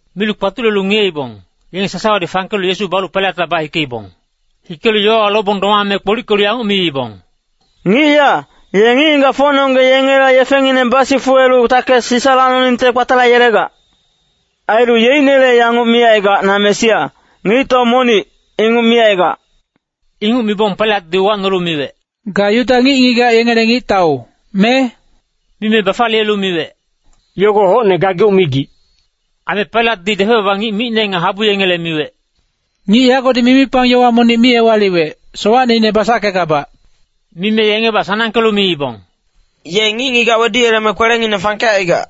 Milu kpatulelu ngiyeibong, yenge sasawadi fangkelu Yesu balu Pailatla bahikeibong. Hikelu yowawa lobong domame kpolickelu yanguc miibong, “Ngic ya, ye ngic-ngigacfocnonggeng yengela yefengineng basifuwelu takes Sisa lacnoningte kpatalayelegac. Ailu yeicnele yanguc micaigac ‘Na Mesia, ngictau monic,’ inguc micaigac.” Inguc mibong Pailatdi uwacnolu miwec, “Ga Yuda ngic-ngigac yengele ngictau, me?” Mime bafaliyelu miwec, “Yogo hocne gageuc migic.” Aime Pailatdi depec-baba ngic micne nga habu yengele miwec, “Ngic yagodi mimipang yowa monic mi ewaliwec, sowacneine basackegabac.” Mime yengebac sanangkelu miibong, “Ye ngic-ngigac weduyeleme kwelengineng fangkecaigac.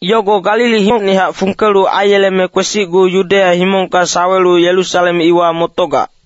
Yogo Galilihocnihac fungkelu aiyeleme kwesicgu Yudeya himongka sawelu Yerusalem iwa motogac.”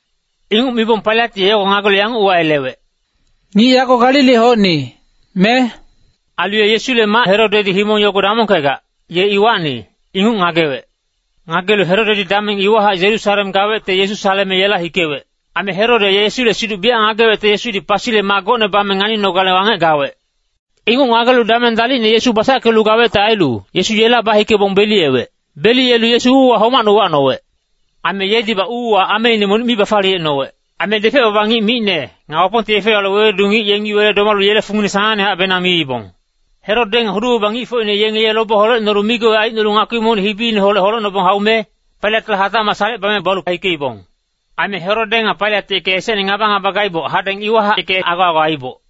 Inguc mibong Pailat ye yogo ngagelu yanguc uwayelewec, “Ngic yago Galilihocni, me?” Ailu ye Yesule mac Herodedi himong yogo damongkegac, ye iwacni, inguc ngagewec. Ngagelu Herode ye dameng iwahac Yerusalem gawecte Yesu saleme yela hikewec. Aime Herode ye Yesule siduc biyac ngagewecte Yesudi pasile maa gocne bame nganinogale wangec gawec. Inguc ngagelu dameng dalicne Yesu basackelu gawecte ailu, Yesu yela bahikebong beliyewec. Beliyelu Yesu uuwa homacne uwacnowec. Aime yedibac uuwa ameine monic mi bafaliyecnowec. Aime depec-baba ngic micne, nga Wapongte yefe-yowale wewedu ngic yengi wele domalu yele fungine sanangnehacbenang miibong. Herode nga hudu-baba ngicfocine yenge ye lobe holecnolu migoi aicnolu ngakpi monic hibineholec holecnobong haume, Pailatla hatacmac salecebame ye balu hikeibong. Aime Herode nga Pailat yeke esecne ngaba-ngaba gaiboc, hadeng iwahac yeke ago-ago aiiboc.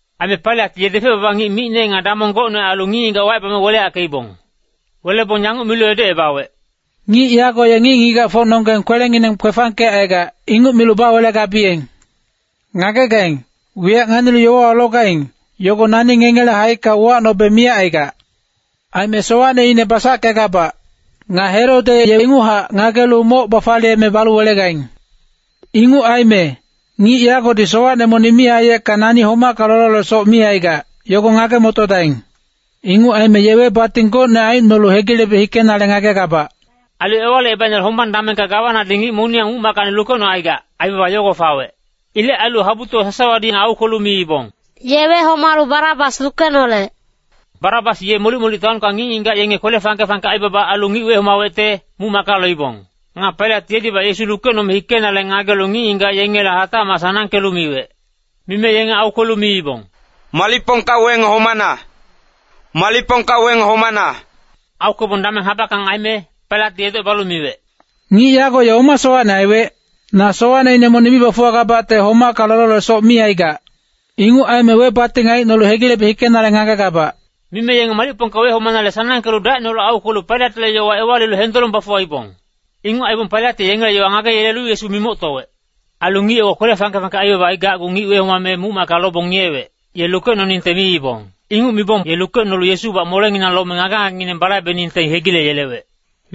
Aime Pailat ye depec-baba ngic micne nga damong gocne ailu ngic-ngigac wacebame weleyackeibong. Welebong yanguc milu edocebawec, “Ngic yago ye ngic-ngigacfocnonggeng kwelengineng kwefangkecaigac, inguc milu bawelegabiyeng. Ngagegaing, wiyac nganilu yowawa logaing, yogo nani ngengele haicka uwacnobe miyac aigac. Aime sowacneine basackegabac. Nga Herode ye inguchac ngagelu moc bafaliyeme balu welegaing. Inguc aime, ngic yagodi sowacne monic mi aiyecka nani homacka lololesoc mi aigac, yogo ngage-motodaing. Inguc aime ye webating gocne aicnolu hegilebe hikenale ngagegabac.” [Ailu Ewalicebaicnele hombang damengka gawanadi ngic moniyang muc-mackacni lukecnocaigac, aibaba yogo fawec.] Ilec ailu habutowa sasawadi aukwelu yanguc miibong, “Ye wehomalu Barabas lukenolec!” Barabas ye molic-molic taonka ngic-ngigac yenge kwele fangke-fangke aibaba ailu ngic wehomawecte, muc-macka loibong. Nga Pailat yedibac Yesu lukecnome hikenale ngagelu ngic-ngigac yengela hatacmac sanangkelu miwec. Mime yenge aukwelu miibong, “Malicpongka weng homana! Malicpongka weng homana!” Aukwebong dameng habackang aime, Pailatdi edocebalu miwec, “Ngic yago ye oma sowacne aiwec? Na sowacneine monic mi bafuwagabacte homacka lololesoc mi aigac. Inguc aime webating aicnolu hegilebe hikenale ngagegabac.” Mime yengi malicpongka homanale sanangkelu dacineholec aukwelu Pailatle yowa ewalilu hendolong bafuwaibong. Inguc aibong Pailat ye yengele yowa ngageyelelu Yesu mimoctowec. Ailu ngic ye kwele fangke-fangke aibaba aigacgu ngic wehomame muc-macka lobong ngiyewec, ye lukecnoningte miibong. Inguc mibong ye lukecnolu Yesubac molenginang lome ngage-ngagengineng balaibeningte hegileyelewec.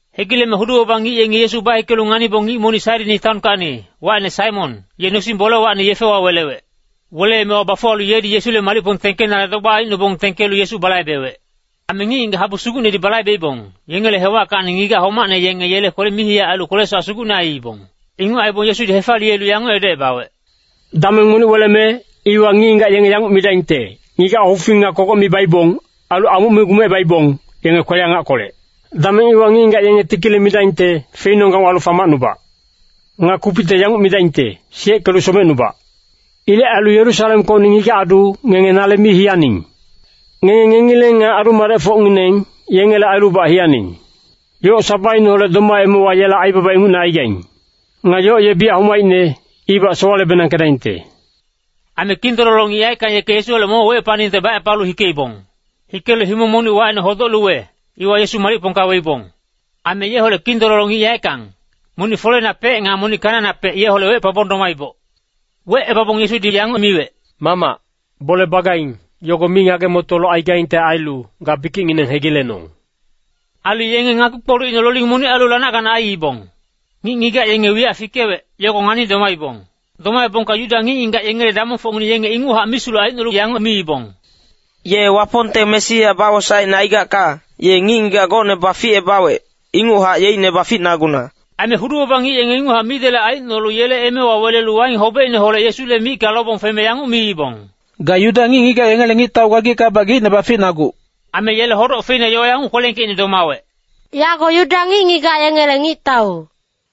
Hegileme hudu-baba ngic yengi Yesu bahikelu nganibong ngic monic Sairini taonkacni, wacine Saimon, ye nosing-bolewacni yefewa welewec. Weleemewa bafuwalu yedi Yesule malicpong tengkenale dogbac aicnobong tengkelu Yesu balaibewec. Aime ngic-ngigac habu sugucnedi balaibeibong, yengele hewackacni ngigac homacne yenge yele mihiyac ailu kwele-sowac sugucne aiibong. Inguc aibong Yesudi hefaliyelu yanguc edocebawec, “Dameng monic weleme, iwa ngic-ngigac yenge yanguc midaingte, ‘Ngigac hufing nga kogoc mi baibong, ailu amuc mi gumecebaibong, yenge kwele-angackolec.’ ‘Dameng iwa ngic-ngigac yenge tikile midaingte, “Feinonggang walu famacnubac!” Nga kupicte yanguc midaingte, “Siyeckelu somecnubac!” ’ Ilec ailu Yerusalemkocni ngigac-adu, ngenge nale mi hiyaning! Ngenge ngengileng nga adu-madecfocngineng, yengele ailubac hiyaning! Yoc sabaineholec domaemewa yela aibaba ingucne aigaing. Nga yoc ye biyac homaicne, ibac sowale-benangkedaingte.” Aime kindololo ngic yaeckang yeke Yesuholec momochac wecepaningte bacepalu hikeibong. Hikelu himong monic wacine Hodoc-luwe, iwa Yesu malicpongka weibong. Aime yeholec kindololo ngic yaeckang, monic foleinapec nga monic kanainapec yeholec wecepabong domaiboc. Wecebabong Yesudi yanguc miwec, “Mamac, bole bagaing, yogo mi ngage-motolu aigaingte ailu, ga bikicngineng hegilenong!” Ailu yenge ngakpi-kpolucine loling monic ailu lanac-ganac aiibong. Ngic-ngigac yenge wiyac fikewec, yogo ngani domaibong. Domaebongka Yuda ngic-ngigac yengele damongfocngineng, yenge inguchac misulec aicnolu yanguc miibong, “Ye Wapongte Mesia bawosaecine aigacka, ye ngic-ngigac gocne baficebawec, ingucnehac yeicne baficnaguna.” Aime hudu-baba ngic yenge inguchac midelec aicnolu yele emewa welelu waing hobecineholec Yesule micka lobong feme yanguc miibong, “Ga Yuda ngic-ngigac yengele ngictau gagickabac geicne baficnaguc!” Aime yele hodoc feina yowa yanguc kwelengkeicne domawec, “Yago Yuda ngic-ngigac yengele ngictau.”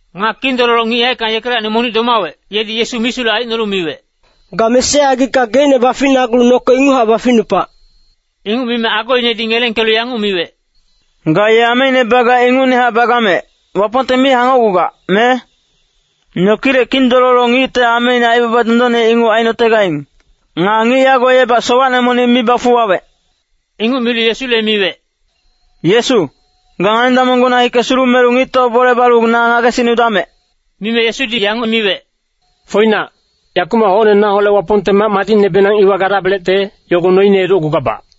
Nga kindololo ngic yaeckang yekelacni monic domawec, yedi Yesu misulec aicnolu miwec, “Ga Mesia aigicka geicne baficnagulu noke inguchac baficnupac!” Inguc mime agoinedi ngelengkelu yanguc miwec, “Ga ye ameine bagac ingucnehac bagamec, Wapongte mi hangocgugac, me? Nokilec kindololo ngicte ameine aibaba dondonne inguc ainotegaing. Nga ngic yago yebac sowacne monic mi bafuwawec.” Inguc milu Yesule miwec, “Yesu, ga ngani-damonggona hike sulumelu ngictaule bole balu na ngagesicnudamec!” Mime Yesudi yanguc miwec, “Foinac, yakumac hocne naholec Wapongte mac madicnebenang iwa gadabelecte, yogo noine edocgugabac.”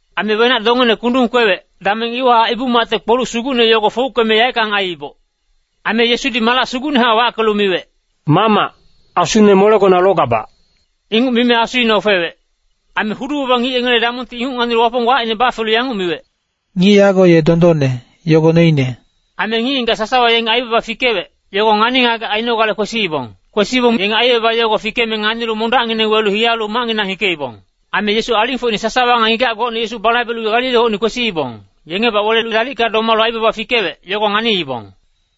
Aime wenac-dongeine kundung kwewec, dameng iwahac Ibu-macte kpoluc sugucne yogo fouckeme yaeckang aiiboc. Aime Yesudi malac sugucnehac wackelu miwec, “Mamac, asune molegona logabac!” Inguc mime asuine ofewec. Aime hudu-baba ngic yengele damongti inguc nganilu Wapong wacine bafelu yanguc miwec, “Ngic yago ye dondonne, yogo noine.” Aime ngic-ngigac sasawa yenge aibaba fikewec, yogo ngani-ngagec ainogale kwesiibong. Kwesibong yenge aibaba yogo fikeme nganilu mondacngineng welu hiyalu macnginang hikeibong. Aime Yesu alingfocine sasawa nga ngigac gocne Yesu balaibelu Galilihocni kwesiibong, yengebac welelu dalicka domalu aibaba fikewec, yogo nganiibong.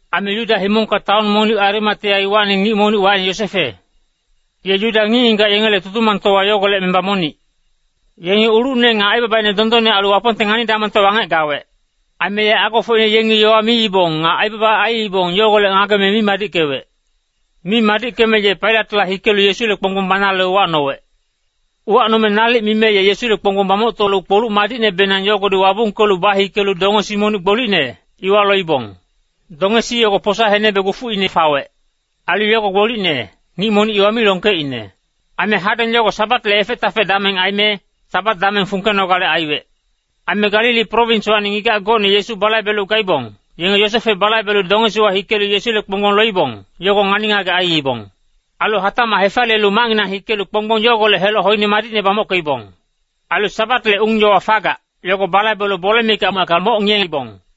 Aime Yuda himongka taon monic Arimatea iwacni ngic monic, wacine Yosefe. Ye Yuda ngic-ngigac yengele Tutumangtowa yogolec memba monic. Ye ngic ulucne nga aibabaine dondonne ailu Wapongte ngani-damongte wangec gawec. Aime ye agofocine yengi yowa miibong nga aibaba aiibong, yogolec ngageme mi madickewec. Mi madickeme ye Pailatla hikelu Yesule kponggbong banale uwacnowec. Uwacnome nalic mime ye Yesule kponggbong bamoctolu kpoluc madicnebenang yogodi wabungkelu bahikelu dongesi monic gbolicne, iwa loibong. Dongesi yogo posa henebe gufuicna fawec. Ailu yogo gbolicne, ngic monic iwa mi longkeicne. Aime hadeng yogo Sabatle efec-tafec dameng aime, Sabat dameng fungkenogale aiwec. Aime Galili prowinswacni ngigac gocne Yesu balaibelu gaibong, yenge Yosefe balaibelu dongesiwa hikelu Yesule kponggbong loibong, yogo ngani-ngagec aiibong. Ailu hatacmac hefaliyelu macnginang hikelu kponggbong yogolec heloc hoine madicne bamockeibong. Ailu Sabatle ung-yowa fagac, yogo balaibelu bole mikac macka moc ngiyeibong.